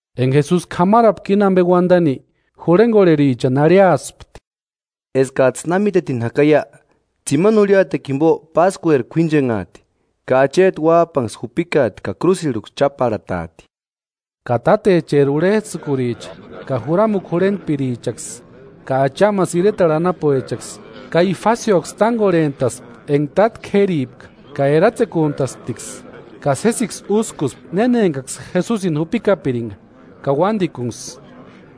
Enka Jesusi k'amarapka íni ampe uantani, jurhenkorherichani arhiaspti: “Eskats'ï na mítetini jakaia, tsimani jurhiatekua jimpo Páskueri k'uínchenhaati ka Acheti Uáp'anksï jupikaati ka krúsirhuksï cháparhataati.” Ka tátecheri urhets'ïkuricha ka juramukua jurhentpirichaksï ka achamasï iretarhu anapuechaksï, Kaifasioksï tánkorhent'aspti enka táta k'éripka, ka eratsekuntasptiksï ka sésiksï úskuspti néna enkaksï Jesusini jupikapirinka ka uántikunksï.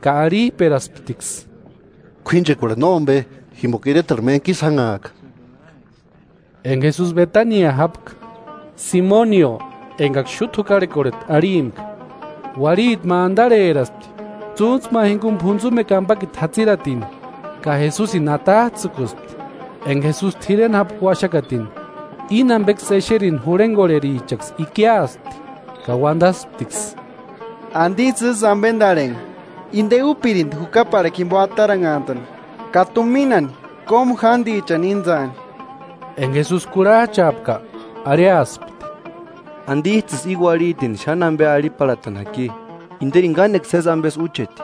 Ka arhip'erasptiksï: “K'uínchekuarhu nómpe, jimpoka iretarhu méntku ísï jánhaaka.” Enka Jesusi Betania jápka, Simonio enkaksï xúta jukarhekorheti arhimpka, uarhiti ma antarheraspti tsúntsu ma jinkuni p'untsumekua ampakiti jatsiratini, ka Jesusini atats'ïkuspti, enka Jesusi t'ireni jápka uaxakatini. Íni ampeksï exerini, jurhenkorherichaksï ikiaspti ka uantasptiksï: “¿Antisï ísï ampentarhenha? Inte úpirinti jukaparhakua jimpo antaranhantani ka tuminani kómu jántichani íntsaani.” Enka Jesusi kurhach'aapka, arhiaspti: “¿Antits'ïsï íni uarhitini xáni ampe arhiparhatani jaki? Interini kánekua sési ampesï úcheti.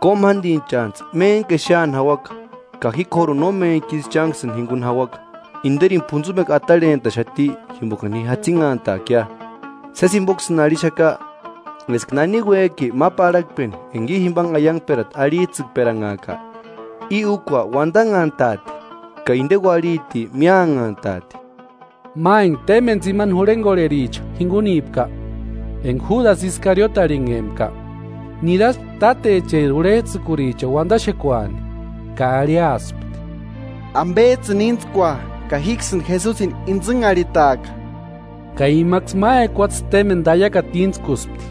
Kómu jántichantsï méntku xéani jauaka, ka ji k'óruni no méntkisï chánksïni jinkuni jauaka, interini p'untsumekua atarhentaxati jimpokani ji jatsinhantaakia. Sési jimpoksïni arhixaka eska náni uék'i ma parhakpeni enka i jimpanhe aiankperata arhits'ïkperanhaaka, i úkua uantanhantaati ka inte uarhiti míanhantaati.” Ma enka témpeni tsimani jurhenkorhericha jinkunipka, enka Júdasï Iskariote arhinhempka, niraspti tátecheri urhets'ïkurichani uantaxekuani, ka arhiaspti: “¿Ampets'ïni íntskua, ka jíksïni Jesusini intsïnharhitaaka?” Ka imaksï ma ekuatse témpeni taiakata íntskuspti.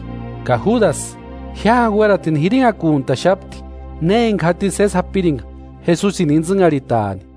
Ka Júdasï jiáni uératini jirinhakuntaxapti na enka jatini sési japirinka Jesusini intsïnharhitaani.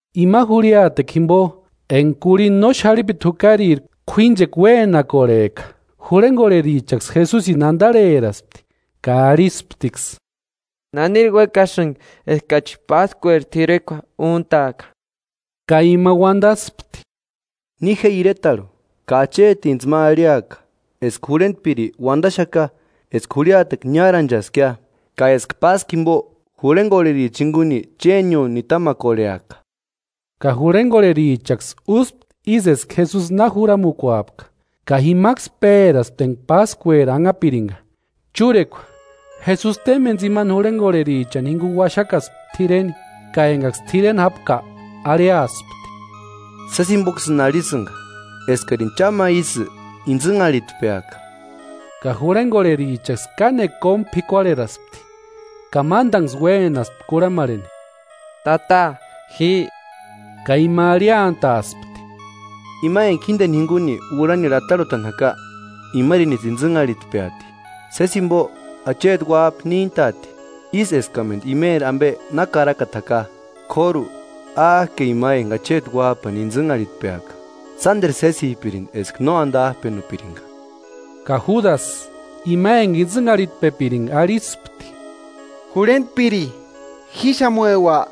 Imani jurhiatekua jimpo enka k'urhinta no xarhipiti jukariri k'uínchekua uénakorhek'a, jurhenkorherichaksï Jesusini antarheraspti ka arhistiksï: “¿Naniri uékasïnki eskachi Páskueri t'irekua úntaaka?” Ka ima uantaspti: “Ni je iretarhu, ka achetintsï ma arhiaka, eska jurhentpiri uantaxaka eska jurhiatekua niáranchaskia; ka eska Páskua jimpo jurhenkorhericha jinkuni chénio nitamakorheaka.” Ka jurhenkorherichaksï úspti ísï eska Jesusi na juramukuapka, ka jimaksï péraspti enka Páskueri anhapirinka. Chúrekua, Jesusi témpeni tsimani jurhenkorherichani jinkuni uaxakaspti t'ireni. Ka enkaksï t'ireni jápka arhiaspti: “Sési jimpoksïni arhisïnka eskarini cha ma ísï intsïnharhitpeaka.” Ka jurhenkorherichaksï kánekua kómu p'ikuarheraspti ka mántanksï uénaspti kurhamarheni: “¿Tata, ji?” Ka ima arhiantaspti: “Ima enka jínteni jinkuni urhanirhu atarhutani jaka, imarinisï intsïnharhitpeati. Sési jimpo Acheti Uáp'a níntaati, ísï eskamentu imeri ampe na karakata jaka, k'óru ¡Áke ima enka Acheti Uáp'ani intsïnharhitpeaka! ¡Sánteru sésipirinti eska no antap'enupirinka!” Ka Júdasï, ima enka intsïnharhitpepirinka arhispti: “¿Jurhentpiri jíxamueua?”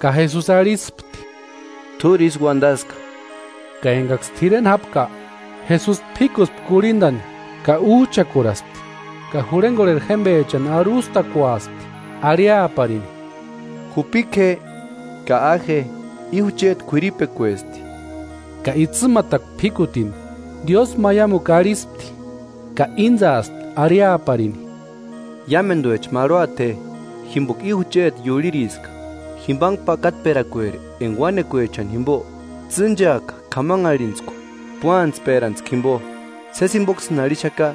Ka Jesusi arhispti: “T'úri ísï uantaska.” Ka enkaksï t'ireni jápka, Jesusi p'íkuspti kurhintani ka úch'akuraspti ka jurhenkorheri jémpechani arhustakuaspti arhiaparini: “Jupika je ka a je, i jucheti k'uiripekuesti.” Ka itsïmatarakua p'íkutini, diósïmaimukua arhispti ka íntsaaspti arhiaparini: “Iámentuecha marhuata je, jimpoka i jucheti iurhiriska, jimpanhe pakatperakueri enka uánekuechani jimpo tsîncheaka k'amanharhintskua p'uantsperantskua jimpo. Sési jimpoksïni arhixaka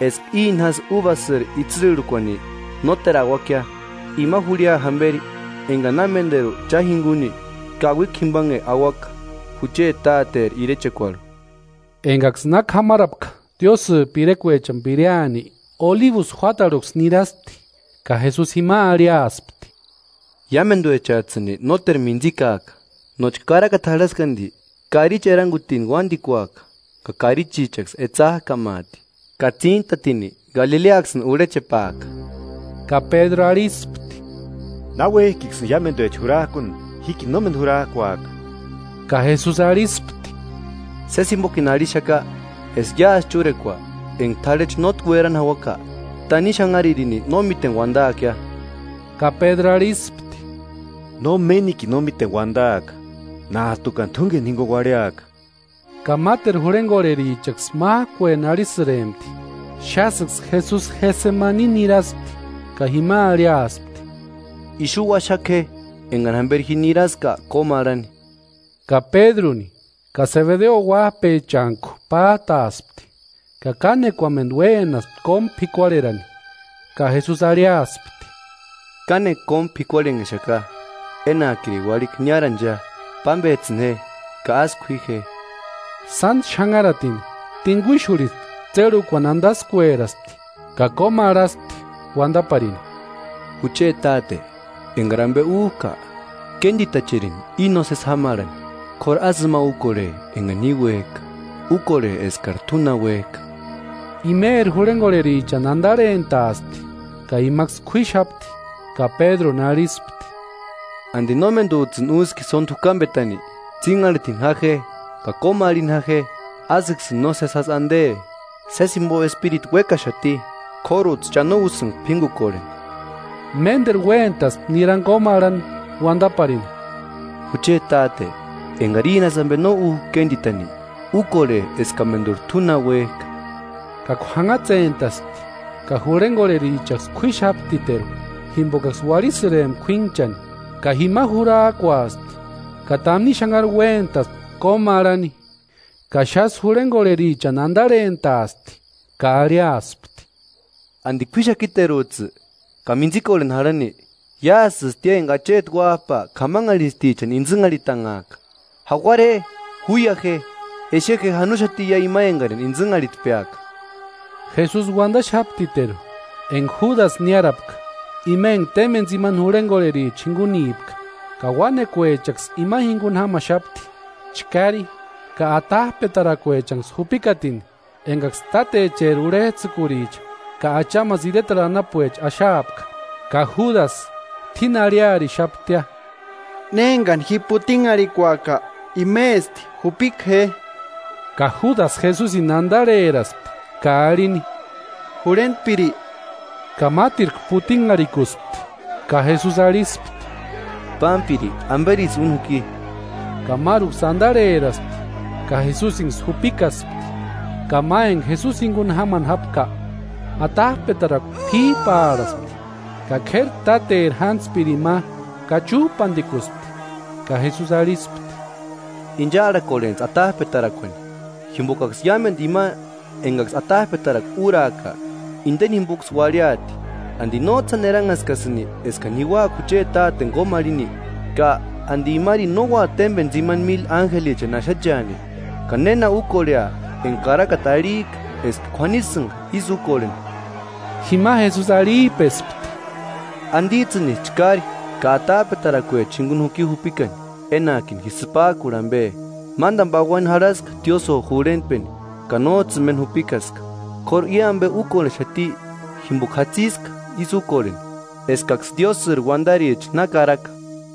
eska íni jásï úbasïri itsïrhukuani nóteruni auaka, ima jurhia jamperi enkani na ménteru cha jinkuni, kauikua jimpanhe auaka jucheti Tateri irechekuarhu.” Enkaksï na k'amarapka Diósïri pirekuechani pireani, Olibusï juátarhuksï niraspti. Ka Jesusi jima arhiaspti: “Iámentuechats'ïni nóteru mintsikaaka, nóchka karakata jarhaski anti: ‘Karichi erankutini uántikuaka ka karichichaksï etsak'amaati.’ Ka tsíntatini, Galileaksïni urhechepaaka.” Ka Pédru arhispti: “Náuek'iksïni iámentuecha jurak'uni, jíkini nómeni jurak'uaka.” Ka Jesusi arhispti: “Sési jimpokini arhixaka eska iásï chúrekua, enka t'arhechu nótki uerani jauaka, tanimu xanharirini no míteni uadaakia.” Ka Pédru arhispti: “Nómenikini no míteni uantaaka, nát'ukani t'únkeni jinkuni uarhiaka” ka máteru jurhenkorherichaksï mák'ueni arhisïrempti. Xásïksï Jesusi Getsemani niáraspti ka jima arhiaspti: “Ixu uaxaka je, enkani jamperi ji niraska kómarhani.” Ka Pédruni ka Sebedeo uáp'echantku pát'aaspti, ka kánekuamentu uénaspti kómu p'ikuarherani. Ka Jesusi arhiaspti: “Kánekua kómu p'ikuarhenhexaka, enak'irini uarhikua niárancheia; pámpets'ïni je ka ásï k'ui je.” Sántku xanharatini, tinkuixurhispti tsérhukuani antaskueraspti ka kómarhaspti uantaparini: “Jucheti Táte, enkari ampe úk'a, kéntitacherini íni nósesi jámarhani; k'óru ásï ima úkorhe enka ji uék'a, úkorhe eskari t'u na uék'a.” Imeri jurhenkorherichani antarhentaaspti ka imaksï kuíxapti ka Pédruni arhispti: “¿Anti nómentuts'ïni úski sónti jukampetani? Tsínharhitini ja je ka kómarhini ja je, ásïksïni nósesi jásï ante. Sési jimpo espiritu uékaxati, k'óruts'ï cha no úsïnka p'ínkukorheni.” Ménteru uéntaspti nirani kómarhani uantaparini: “Jucheti Táte, enkari íni jásï ampe no úk'a kéntitani, úkorhe eskamenturi t'u na uék'a.” Ka k'uanhatsentaspti ka jurhenkorherichaksï k'uíxaptiteru, jimpokaksï uarhisïrempka k'uínhchani. Ka jima jurak'uaspti ka tanimu xanhari uéntaspti kómarhani. Ka xásï jurhenkorherichani antarhentaaspti ka arhiaspti: “¿Anti k'uíxakiteruts'ï, ka mintsikorheni jarhani? Iásïstia enka Acheti Uáp'a k'amanharhint'atichani intsïnharhitanhaaka. ¡Jauara je, júia je! Exe je, janoxatiia ima enkarini intsïnharhitpeaka.” Jesusi uantaxaptiteru enka Júdasï niárapka, ima enka témpeni tsimani jurhenkorhericha jinkunipka, ka uánekuechaksï ima jinkuni jámaxapti, chkári ka atap'etarakuechanksï jupikatini, enkaksï tátecheri urhets'ïkuricha ka achamasï iretarhu anapuecha axaapka. Ka Júdasï t'úini arhiarixaptia: “Néni enkani ji putinharhikuaka, imesti, jupika je.” Ka Júdasï Jesusini antarheraspti ka arhini: “¡Jurhentpiri!” Ka mátirku putinharhikuspti. Ka Jesusi arhispti: “Pámpiri, ¿Amperisï úni juki?” Ka máruksï antarheraspti ka Jesusinksï jupikaspti. Ka ma enka Jesusi jinkuni jámani jápka, atap'etarakua p'íp'arhaspti, ka k'éri táteri jántspirini ma kachup'antikuspti. Ka Jesusi arhispti: “Inchaarhakorhentsï atap'etarakuani, jimpokaksï iámentu ima enkaksï atap'etarakua úrak'a, inteni jimpoksï uarhiati. ¿Anti nóts'ï sáni eranhaskasïnki eskani ji úaka jucheti Táteni kómarhini? Ka ¿Anti imarini no ua témpeni tsimani míli ánjelichani axacheani? ¿Ka néna úkorhea enka karakata arhik'a eska k'uanisïnka ísï úkorheni?” Jima Jesusi arhip'espti: “¿Antits'ïnisï chkári ka atap'etarakuechani jinkuni juki jupikani, enak'ini ji sïpak'urha ampe? Mántani pauani jarhaska tiósïo jurhentpeni ka nóts'ïni méni jupikaska. K'óru i ampe úkorhexati jimpoka jatsiska ísï úkorheni, eskaksï Diósïri uantaricha na karaka.”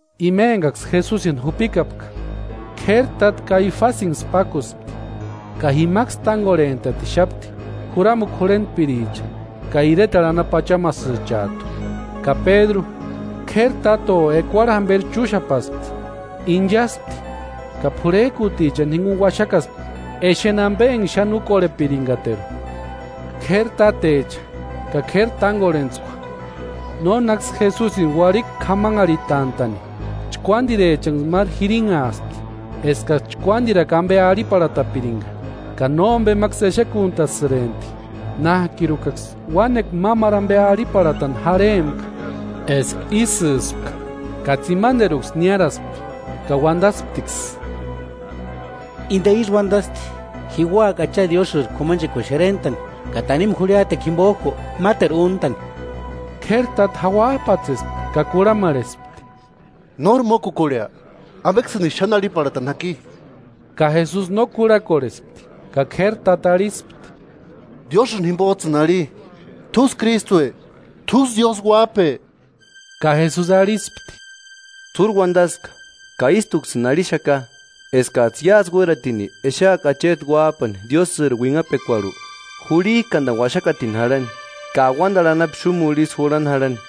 Ima enkaksï Jesusini jupikapka, k'éri táta Kaifasinksï pákuspti, ka jimaksï tánkorhent'atixapti juramukua jurhentpiricha ka iretarhu anapu achamasïchat'u. Ka Pédru k'éri táto ekuarhu jamperi chúxapaspti. Inchaspti ka p'urhek'utichani jinkuni uaxakaspti exeni ampe enka xáni úkorhepirinkateru. K'éri tátecha ka k'éri tánkorhentskua, nónaksï Jesusini uarhikua k'amanharhitant'a'ni, chkuádirechanksï máru jirinhaaspti eskaksï chkuántirakua ampe arhiparhatapirinka, ka nómpemaksï exekuntasïrempti, nák'ikuraksï uánekua mámaru ampe arhiparhatani jarhempka eska ísïspka, ka tsimanterkuksï niáraspti, ka uantasptiksï: “Inte uantasti: ‘Ji úaka Acha Diósïri k'umanchekuani xerent'ani ka tanimu jurhiatekua jimpok'u máteru úntani.’” K'éri táta jauap'atsespti ka kurhamarhespti: “¿Nóri mókukurhea? ¿Ampeksïnisï xáni arhiparhatani jáki?” Ka Jesusi no kurhakorhespti. Ka k'éri táta arhispti: “¿Diósïni jimpots'ïni arhi, t'úsï Krístue, t'úsï Diósï Uáp'e?” Ka Jesusi arhispti: “T'úri uantaska. Ka ístuksïni arhixaka, eskats'ï iásï uératini exeaka Acheti Uáp'ani Diósïri uinhapekuarhu jurhik'antani uaxakatini jarhani, ka auantarhu anapu xúmurhu ísï jurhani jarhani.”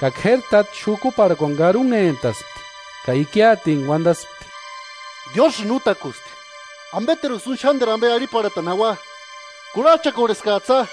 Ka k'éri táta xukuparhakuani karunhentaspti ka ikiatintku uantaspti: “¡Diósïni útakusti! ¿Ampeteruksï úni xánteru ampe arhiparhatani jaua? Kurhach'akorheskats'ïa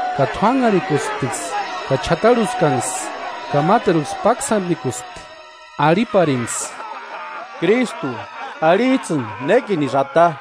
Ka t'uánharhikuspti ka ch'atarhuskanksï ka máteruksï páksantikuspti, arhiparinksï: “¿Krístu, arhits'ïni nékinisï ata?”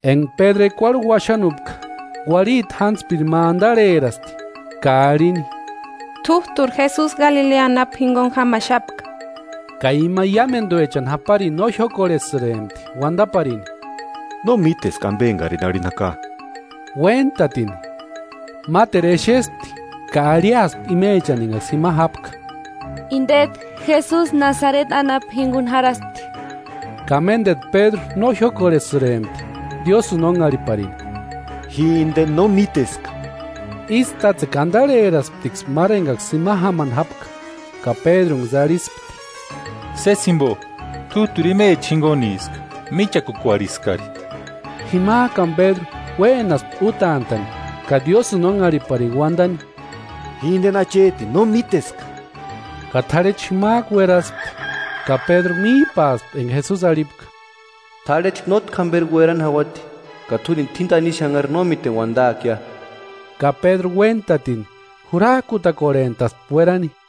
Enka Pédru ekuarhu uaxanupka, uarhiti jántspiri ma antarheraspti ka arhini: T'út'uri Jesusi, Galilea anapu jinkuni jámaxapka. Ka ima iámentuecha japarini no jiókorhesïrempti uantaparini: “No míteska ampe enkarini arhini jaka.” Uéntatini, máteru exespti ka arhiaspti imechani enkaksï jima jápka: “Intet'u Jesusi, Nasareti anapu jinkuni jarhaspti.” Ka ménteru Pédru no jiókorhesïrempti Diósïni ónharhiparini: “¡Ji inteni no míteska!” Ísï tátsekua antarherasptiksï máru enkaksï jima jámani jápka, ka Pédrunksï arhispti: “Sési jimpo t'út'uri imecha jinkuniska, míchakukorheskari.” Jimakani Pédru uénaspti útant'a'ni ka Diósïni ónharhiparini uantani: “¡Ji inteni achetini no míteska!” Ka t'arhechu jimak'u ueraspti. Ka Pédru míp'aaspti enka Jesusi arhipka: “T'arhechu nótki jamperi uerani jauati, ka t'úrini tanimu xanhari no míteni uantaakia”. Ka Pédru uéntatini, jurak'utakorhent'aspti uerani.